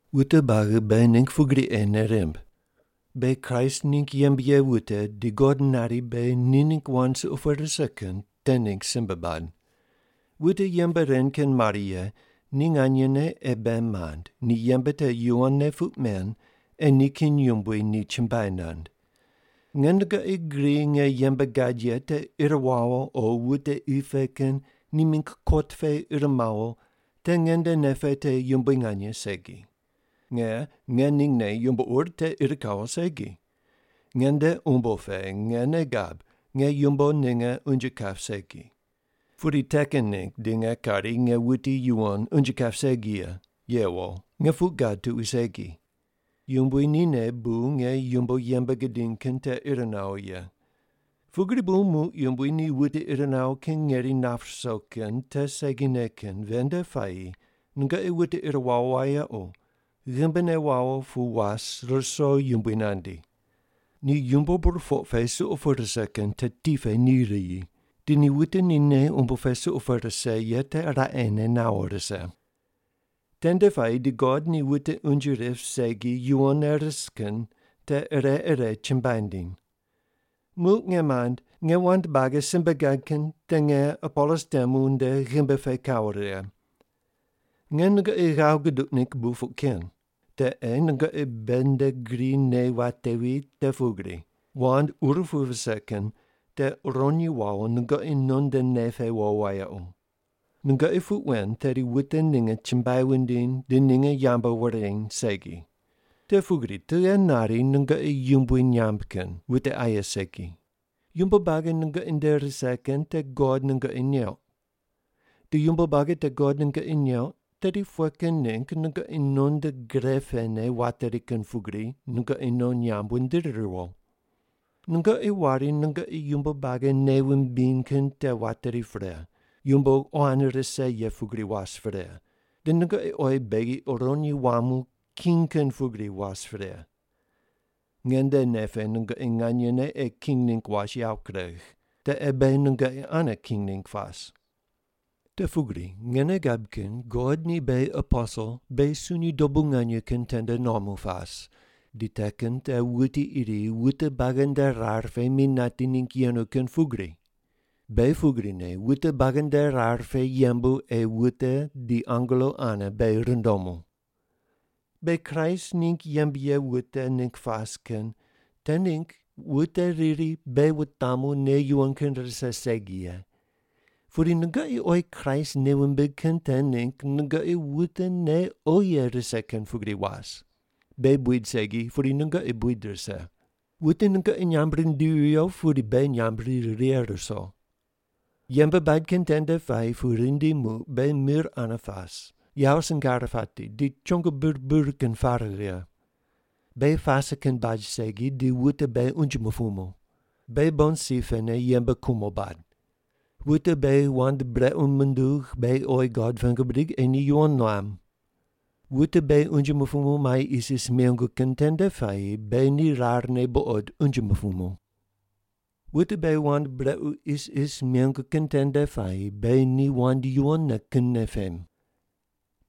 Wute buagi beghi ningg pugri ei nei rimb: Beghi Kraist ningg yembe ye wute di God nari beghi ni ningg wand suqo pu rise kin te ningg simbe bad. Wute yembe ren kin mare ye ni nganyene ei bei mand ni yembe te yuwonne puq men ei nikin yumbui ni chumbuai nand. Nge nungoqi gri nge yembe gad ye te ir wawo o wute qi pe kin ni mingg kot pe ir mawo te nge nde nei pe te yumbui nganye segi. Nge ngeningne yumbo ur te ir kawo segi. Nge nde umbo pe nge nei gab nge yumbo ninge unje kap segi. Pudi te kin ningg di nge kari nge wuti yuwon unje kap segi ye, yewo nge puq gad tuqui segi. Yumbui nine bu nge yumbo yembe gidiny kin te ir nawo ye. Pugri bu muq Yumbui ni wute ir nawo kin ngeri nap ruso kin te segine kin ven nde puayi nungoqi wute ir wawo wayequ, ghimbine wawo pu was ruso Yumbui nandi. Ni yumbo burpoq pe suqo pu rise kin te ti pe ni riyi, di ni wute ni nei umbo pe suqo pu rise ye te raqene nawo rise. Tende puayi di God ni wute unje rip segi yuwonne ris kin te ire ire chumbuai nindiny. Muq nge mand, nge wand buagi simbe gad kin te nge Apolos temu nde ghimbi pe kawo righe. Nge nungoqi ghav guduq ningg bu puq ken. Te ei nungoqi beghi nde gri nei watevi te pugri, “Wand ur pu vise kin te uronyi wawo nungoqi non nde nei pe wo wayequ.” Nungoqi puq wen tedi wute ninge chumbuai wundiny di ninge yambu wureny segi. Te pugri tughe nari nungoqi yumbui nyamb kin, wute aye segi? Yumbo buagi nungoqi nde rise kin te God nungoqi neuq. Di yumbo buagi te God nungoqi neuq tedi pughe kin ningg nungoqi non nde gre pene wateri kin pugri nungoqi non nyamb wundiri riwo? Nungoqi wari nungoqi yumbo buagi nei wumbiny kin te wateri pre, yumbo quan rise ye pugri was pre, di nungoqi oyi beghi uronyi wuamu king kin pugri was pre. Nge nde nei pe nungoqi nganyene ei king ningg was yawo kuregh. Te ei beghi nungoqi ane king ningg pas. Te pugri nge nei gab kin God ni beghi aposel beghi sunyi dobu nganye kin tende nuamu pas, di te kin te wuti iri wute buagi nde rar pe mi nati ningg yenu kin pugri. Beghi pugrine wute buagi nde rar pe yembu ei wute di angelo ane beghi rundomu. Beghi Kraist ningg yembe ye wute ningg pas kin te ningg wute riri beghi wutamu nei yuwon kin rise segi ye, pudi nungoqi oyi Kraist nei wumbig kin te ningg nungoqi wute nei oghi ye rise kin pugri was. Beghi buid segi pudi nungoqi buid rise. Wute nungoqi nyamb rindivi viyo pudi beghi nyamb ri righe ruso. Yembe bad kin tende puayi pu rindi muq beghi mir ane pas, yawo singar pati di chongo bir bir kin pare righe. Beghi pase kin baj segi di wute beghi unje mupumu. Beghi bon si pene yembe kumo bad. Wute beghi wand brequ mundug, beghi oyi God pengu bidig ei ni yuwon nuam. Wute beghi unje mupumu mai isis mengu kin tende puayi beghi ni rarne buqod unje mupumu. Wute beghi wand brequ isis mengu kin tende puayi beghi ni wand yuwon kinne pem.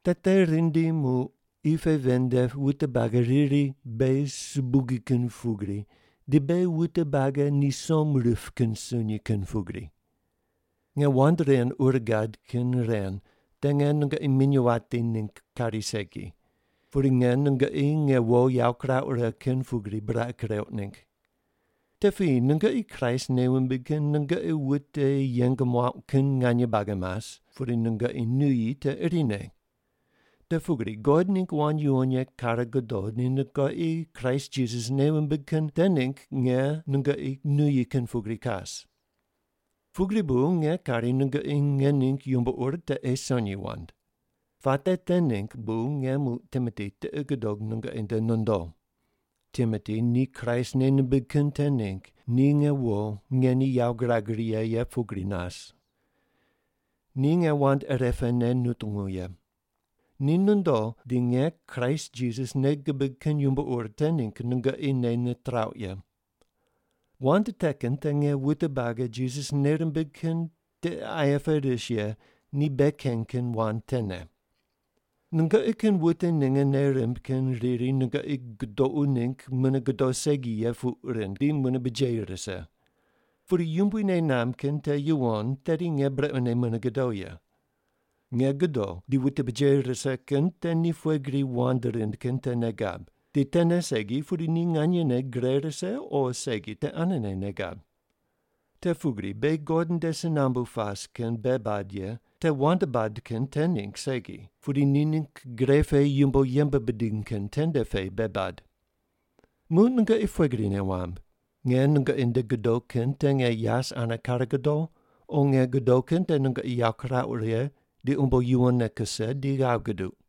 Te te rindi muq qi pe ven nde wute buagi riri beghi subugi kin pugri di beghi wute buagi ni som rip kin sunyi kin pugri. Nge wand ren ur gad kin ren te nge nungoqi minyuw wati ningg kari segi, pudi nge nungoqi nge wo yawo kirauq righe kin pugri buraqi kireuq ningg. Te piyi nungoqi Kraist nei wumbig kin nungoqi wute yeng muauq kin nganye buagi mas, pudi nungoqi nuyi te irine. Te pugri God ningg wand yuwon ye kare godo di nungoqi Kraist Jisas nei wumbig kin te ningg nge nungoqi nuyi kin pugri kas. Pugri bu nge kari nungoqi nge ningg yumbo ur te ei sonyi wand. Puate te ningg bu nge muq Timoti tiqi gudog nungoqi nde nondo. Timoti ni Kraist nei nimbig kin te ningg ni nge wo nge ni yawo girag righe ye pugri nas. Ni nge wand irepene nutungu ye. Ni nondo di nge Kraist Jisas nei gibig kin yumbo ur te ningg nungoqi nei nitrauq ye. Wand te kin te nge wute buagi Jisas nei rimbig kin tiqe aye pe ris ye ni bei keny kin wand tene. Nungoqi kin wute ninge nei rimb kin riri nungoqi gudoqu ningg mune godo segi ye puq rind di mune bujeyi rise. Pudi Yumbui nei namb kin te yuwon tedi nge brequne mune godo ye. Nge godo di wute bujeyi rise kin te ni pughe gri wand rind kin te nei gab, di tene segi pudi ni nganyene gre rise o segi te anene nei gab. Te pugri beghi God nde si nambu pas kin bei bad ye te wand bad kin te ningg segi pudi ni ningg gre pe yumbo yembe bidiny kin tende pe bei bad. Muq nungoqi pughe gri nei wamb? Nge nungoqi nde godo kin te nge yas ane kare godo o nge godo kin te nungoqi yawo kirauq righe di umbo yuwonne kuse di ghav guduq?